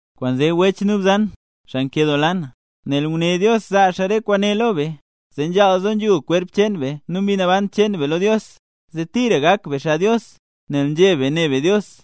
Kwaanzee wech nu bzan, xaa nkedoola na, nel nguné Dios zaa Dios re kwaane lo be, zee nzhaal zo nzhul kwerp cheen be nu mbi naban cheen be lo Dios, zee tira gak be xaa Dios, nel nzheb be ne be Dios.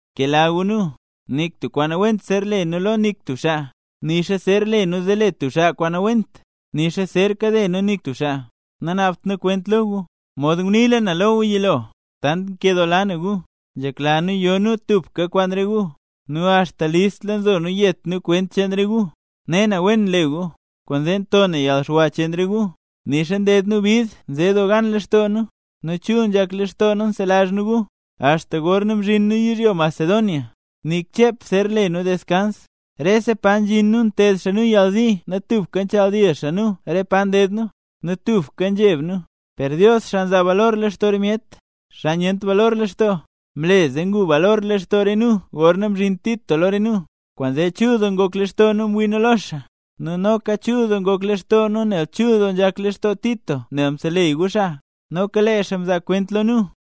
¡Bkela gu nu! Nik tub kwaan nawent zer le nu lo nik tub xaa, nixa zer le nu zee le tub xaa kwaan nawent, nixa zer kade nu nik tub xaa. Nanaabt na kwent lo gu. Mod nguniila na lo gu yilo, tant nkedoola nu gu, nzhekla nu yo nu tubka kwaan re gu, nu axta listla nzo nu yet nu kwent cheen re gu. Ne na, wen nle gu, kwaanzee nto na yalxwa cheen re gu; nixa nded nu bid nze doo gan lextoo nu, nu chul nzhak lextoo nu nselazh nu gu. Axta gorna mzhin nu yizhyo Macedonia, nik chep zer le nu deskans, rese pa nzhin nu nted xaa nu yalzi nu tubka nchaal dil xaa nu re pa nded nu, nu tubka nzheb nu. Per Dios, xaa nzaa balor lextoo re myet, xaa nyent balor lextoo, mle zee ngu balor lextoo re nu gorna mzhin Tito lo re nu. Kwaanzee chul doo ngok lextoo nu mwii nu lo xaa, nu noka chul doo ngok lextoo nu nel chul doo nzhak lextoo Tito nel mseleyy gu xaa. Noka lee xaa mzaa kwent lo nu,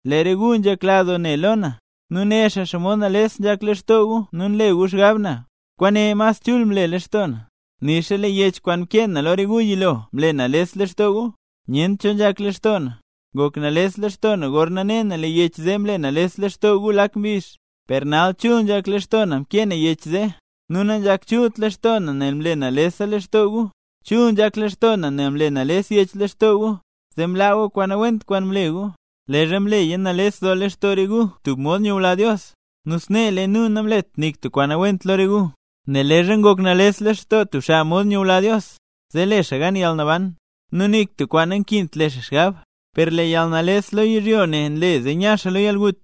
lee re gu nzhekla doo ne lo na, nu né xaa xomod nales nzhak lextoo gu nu nle gu xgab na, kwaane mas chul mle lextoo na. Nixa lee yech kwaan mkee na lo re gu yilo mle nales lextoo gu, nyent cho nzhak lextoo na. Ngok nales lextoo na gorna ne na lee yech zee mle nales lextoo gu lak mbizh; per nal chul nzhak lextoo na mkee na yech zee. Nu nanzhak chult lextoo na nel mle nalesa lextoo gu, chul nzhak lextoo na nel mle nales yech lextoo gu, zee mlaa gu kwaan nawent kwaan mle gu. Leezha mleya nales doo lextoo re gu tub mod nyula Dios, nu snee lee nu namlet nik tub kwaan nawent lo re gu. Nel leezha ngok nales lextoo tub xaa mod nyula Dios, zee le xaa gan yalnaban, nu nik tub kwaan nankint le xaa xgab. Per lee yalnales lo yizhyo ne nle zee nya xaa lo yalgut.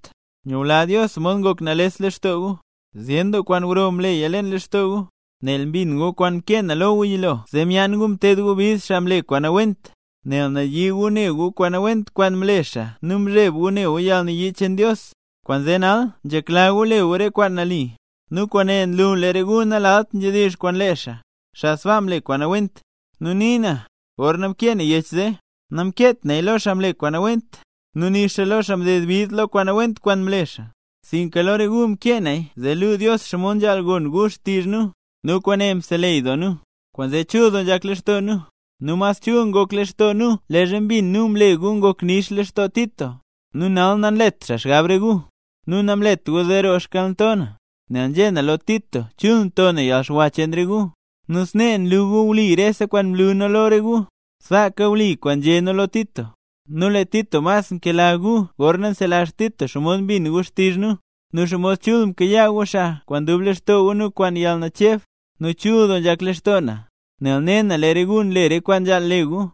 Nyula Dios mod ngok nales lextoo gu. ¡Zyen doo kwaan gro mleya leen lextoo gu! Nel mbin gu kwaan mkee na lo gu yilo zee myaan gu mted gu bid xaa mle kwaan nawent, nel nayii gu ne gu kwaan nawent kwaan mle xaa nu mzheb gu ne gu yalnayii cheen Dios; kwaanzee nal nzhekla gu le gu re kwaan nali. Nu kwaane nlu lee re gu nalalt nzhedizh kwaan lee xaa, xaa sbaa mle kwaan nawent. Nu nii na, gorna mkee na yech zee, namkeet naya lo xaa mle kwaan nawent, nu nixa lo xaa mded bid lo kwaan nawent kwaan mle xaa; sinka lo re gu mkee naya zee luu Dios xomod nzhaal gon gu xtizh nu. Nu kwaane mseleyy doo nu. Kwaanzee chul nzhak lextoo nu, nu mas chul ngok lextoo nu leezha mbin nu mle gu ngoknix lextoo Tito, nu nal nanlet xaa xgab re gu. Nu namlet gu zee roo xkalnto na, nel nzhé na lo Tito chul nto na yalxwa cheen re gu. Nu snee wli rese kwaan mlu nu lo re gu, sbaaka wli kwaan nzhé nu lo Tito. Nu lee Tito mas nkela gu gorna nselazh Tito xomod mbin gu xtizh nu, nu xomod chul mkayaa gu xaa kwaan dub lextoo gu nu kwaan yalnacheb. ¡Nu chul doo nzhak lextoo na, nel ne na lee re gu nle re kwaan nzhaal le gu!